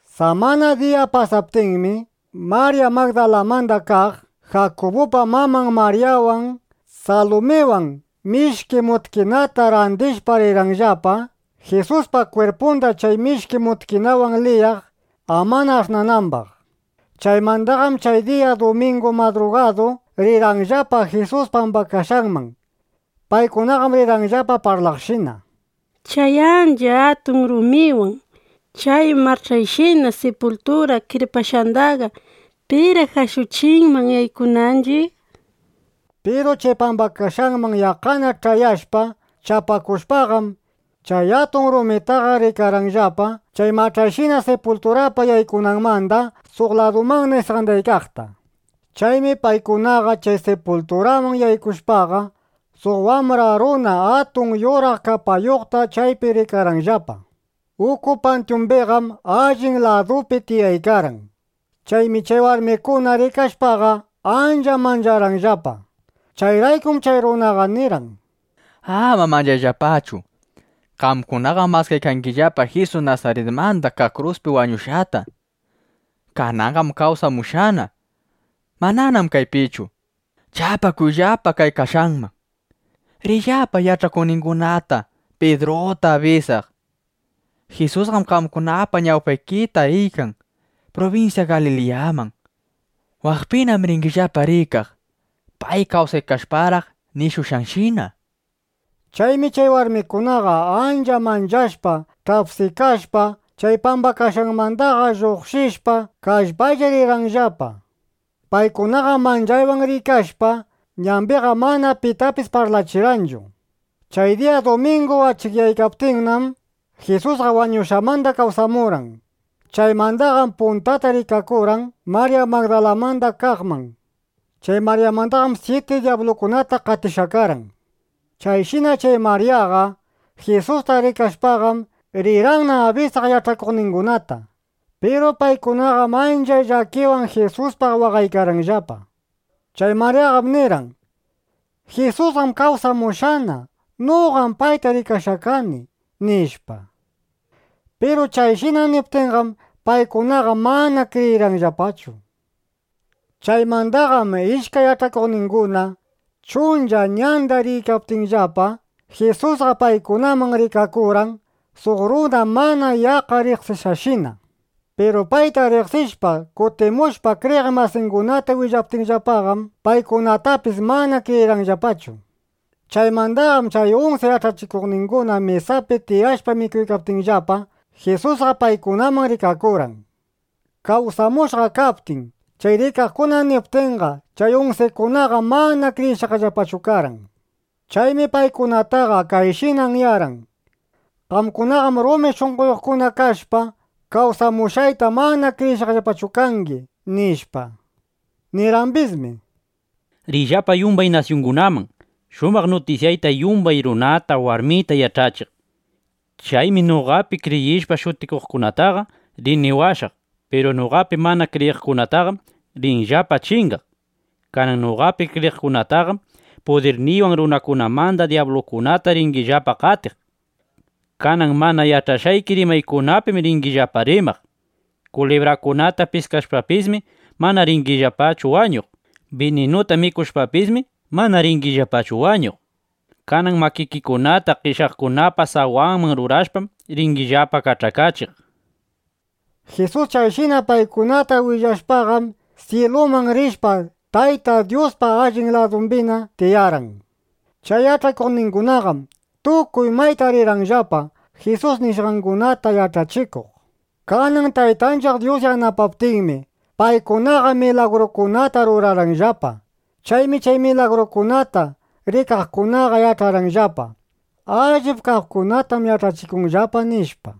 Samana diya pasaptinmi, Marya Magdalamanda kaq, Jakubupa maman Maryawan, Salumiwan mishki mutkinata randishpa rirqanllapa, Jisuspa kwirpunda chay mishki mutkinawan liyaq, ama ash'nanambaq. Chaymandaqam chay diya dumingu madrugadu rirqanllapa Jisus pambakashqanman. Paykunaqam rirqanllapa parlaqshina: —Chay ancha atun rumiwan chay mach'ayshina sipultura kirpashqandaqa ¿piraq ashuchinman yaykunanchiq? nishpa. Piru chay pambashqanman yaqqana ch'ayashpa, chapakushpaqam, chay atun rumitaqa rikarqanllapa chay mach'ayshina sipulturapa yaykunanmanda suq ladumanna isqandaykaqta. Chaymi paykunaqa chay sipulturaman yaykushpaqa, suq wambra runa atun yuraq kapayuqta chaypi rikarqanllapa. Uku pantyumbiqam allin ladupi tiyaykarqan. Chaymi chay warmikuna rikashpaqa, ancha mancharqanllapa. Chayraykum chay runaqa nirqan: —Ama manchayllapachu. Qamkunaqam maskaykangillapa Jisus Nasaritmanda kaq kruspi wañushqata. Kananqam kawsamushqana. Mananam kaypichu. Chapakuyllapa kay kashqanman. Riyllapa yach'akuqningunata, Pidruta abisaq: “Jisusqam qamkunapa ñawpaykita riykan prubinsya Galiliyaman. Waqpinam ringillapa rikaq, pay kawsaykashparaq nishushqanshina”, nishpa. Chaymi chay warmikunaqa ancha manchashpa, ch'apsikashpa, chay pambakashqanmandaqa lluqshishpa, kallpaylla rirqanllapa. Paykunaqam manchaywan riykashpa, ñambiqa mana pitapis parlachirqanchu. ˻Chay diya dumingu achikyaykaptinnam, Jisusqa wañushqanmanda kawsamurqan. Chaymandaqam puntata rikakurqan Marya Magdalamanda kaqman. Chay Maryamandam syiti dyablukunata qatishqa karqan. Chayshina chay Maryaqa Jisusta rikashpaqam, rirqanna abisaq yach'akuqningunata. Piru paykunaqam ancha llakiwan Jisuspaq waqaykarqanllapa. Chay Maryaqam nirqan: —¡Jisusqam kawsamushqana! Noqam payta rikashqa kani, nishpa. Piru chayshina niptinqam, paykunaqa mana kriyirqanllapachu. Chaymandaqam ishkay yach'akuqninguna chuncha ñanda riykaptinllapa, Jisusqa paykunaman rikakurqan suq runa mana yaqqa riqsishqashina. Piru payta riqsishpa, kutimushpa, kriyiq masingunata willaptinllapaqam, paykunatapis mana kriyirqanllapachu. Chaymandaqam chay unsi yach'akuqninguna mesapi tiyashpa mikuykaptinllapa, Jisusqa paykunaman rikakurqan. Kawsamushqa kaptin, chay rikaqkuna niptinqa, chay unsikunaqa mana kriyishqallapachu karqan. Chaymi paykunataqa kayshina anyarqan: —Qamkunaqam rumi shunqoyuqkuna kashpa, kawsamushqayta mana kriyishqallapachu kangi, nishpa. Nirqambismi: —Riyllapa yumbay nasyungunaman, shumaq nutisyayta yumbay runata, warmita yach'achiq. Chaymi noqapi kriyishpa shutikuqkunataqa rini washaq. Piru noqapi mana kriyiqkunaqam rinllapa chingaq. Kanan noqapi kriyiqkunaqam pudirniywan runakunamanda dyablukunata ringillapa qatiq. Kanan mana yach'ashqayki rimaykunapim ringillapa rimaq. Kulibrakunata piskashpapismi, mana ringillapachu wañuq. Bininuta mikushpapismi, mana ringillapachu wañuq. Kanan makikikunata qeshyaqkunapa sawanman rurashpam, ringillapa kach'akachiq. Jisus chayshina paykunata willashpaqam, syiluman rishpa, Tayta Dyuspa allin ladumbina tiyarqan. Chay yach'akuqningunaqam tukuy mayta rirqanllapa, Jisus nishqangunata yach'achikuq. Kanan Taytanchiq Dyus yanapaptinmi, paykunaqa milagrukunata rurarqanllapa. Chaymi chay milagrukunata rikaqkunaqa yach'arqanllapa: Allip kaqkunatam yach'achikunllapa, nishpa.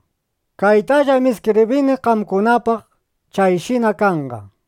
Kaytallam iskibrini qamkunapaq. Chayshina kanqa.˼